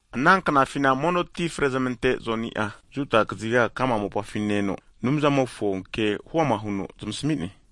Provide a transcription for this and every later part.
Ana knafina mono ti frezmante Joni'a, Judia kaziga ka'ma mopafi ne-eno Anumzamofo ke huama huno zamasmi'ne.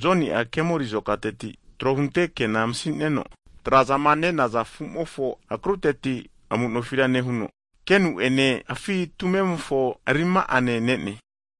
Joni'a kemori azokateti trohunte kena masi'neno, trazama nenaza afu'mofo akruteti amu'nofira nehuno, kenu'ene, afi' tumemofo rima'ane ne'ne.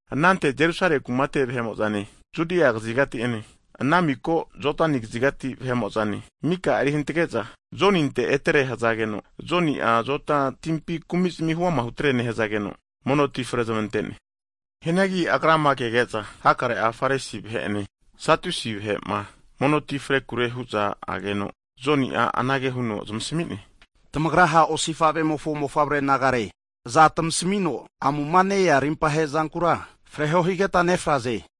Anante Jerusale kumate vahemo'zane, Judia kazigati ene, ana mika Jodani kzigati vahe'mo'zane mika eri hantage'za Joninte etere hazageno, Joni'a Jodani timpi huama kumi'zmi hutere nehzageno, mono ti fre zamante'ne. Hianagi agrama kege'za hakare'a Farisi vahe'ene, Sadusi vahe'ma mono ti frekure hu'za ageno, Joni'a anage huno zamasmi'ne, tamagra ha' osifavemofo mofavre nagare, aza tmasmino amuma ne-ea Anumzamofo rimpahe zampintira fregahaze.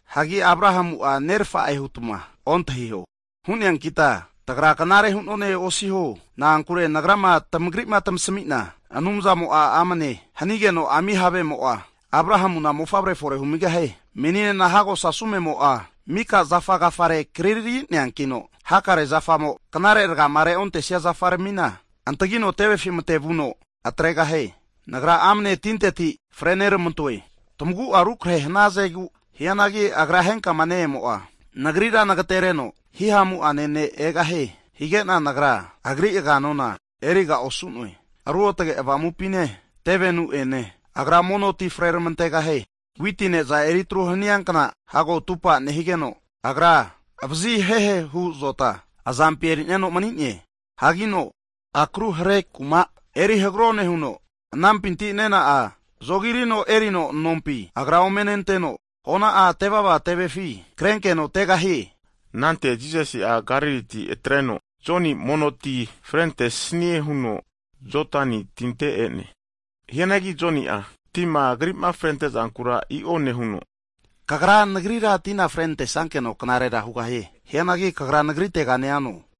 hagi Abrahamu'a nerfakita, tagra knare hunone hutma osiho. Na'ankure nagrama tmagri'ma tmasmi'na, Anumzamo'a amne hanigeno ami havemo'a, Abrahamuna mofavre fore humigahie. Meninena hago sasumemo'a mika zafa agafare kriri'neankino, hakare zafamo knare rgama reontesia zafa'rmina, antagino tevefi mate'vuno atregahie. Nagra amne tinteti mono tina fre nermantoe, tmagu'a rukrahe hnazegu, hianagi Agra henkama ne-emo'a nagrira nagtereno hihamu'ane ne' egahie, higena nagra Agri aganona (sendol) erizafiga osu'noe. Ruotge Avamupine, tevenu'ene Agra mono tina fre tmante'gahie. Witi ne'za eri atru hania kna hago atupa nehigeno, Agra vazihehehu azota azampi erino mani'ne. Hanki akru hre kuma eri hagro nehuno, anampinti nena'a zogirino erino nompi Agra ome nenteno, hona'a tevava tevefi krenkeno tegahie. Anante Jisasi'a Galiliti atreno Joni mono ti frente'snie huno Jodani tinte e'ne. Hianagi Joni'a tima Agri'ma frente'zankura i'o nehuno, Kagra, nagrira tina fre nantesankeno knarera hugahie, hianagi Kagra nagritega neano?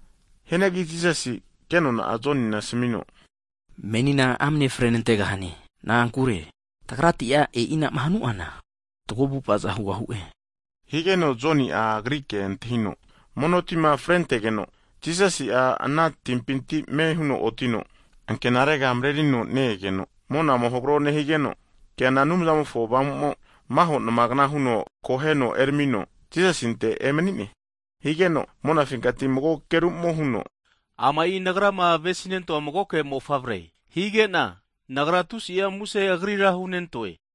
Hianagi Jisasi ke nona'a Jonina asmi'no, Menina amne fre nantegahane, na'ankure tagrati'a e'inama hanu'ana fatgo avu'avaza hugahue, higeno Joni'a Agri ke antahino, mono tima frentegeno, Jisasi'a ana timpinti ame huno otino ankenarega mrerino ne-egeno, monamo hagro nehigeno, keana Anumzamofo Avamu'mo maho nma'gna huno akoheno eramino Jisasinte emani'ne. Higeno, monafinkati mago ageru'mo huno, Ama'i Nagrama avesinento'a magoke Mofavre, hige'na Nagra tusi'a muse Agrira hunentoe.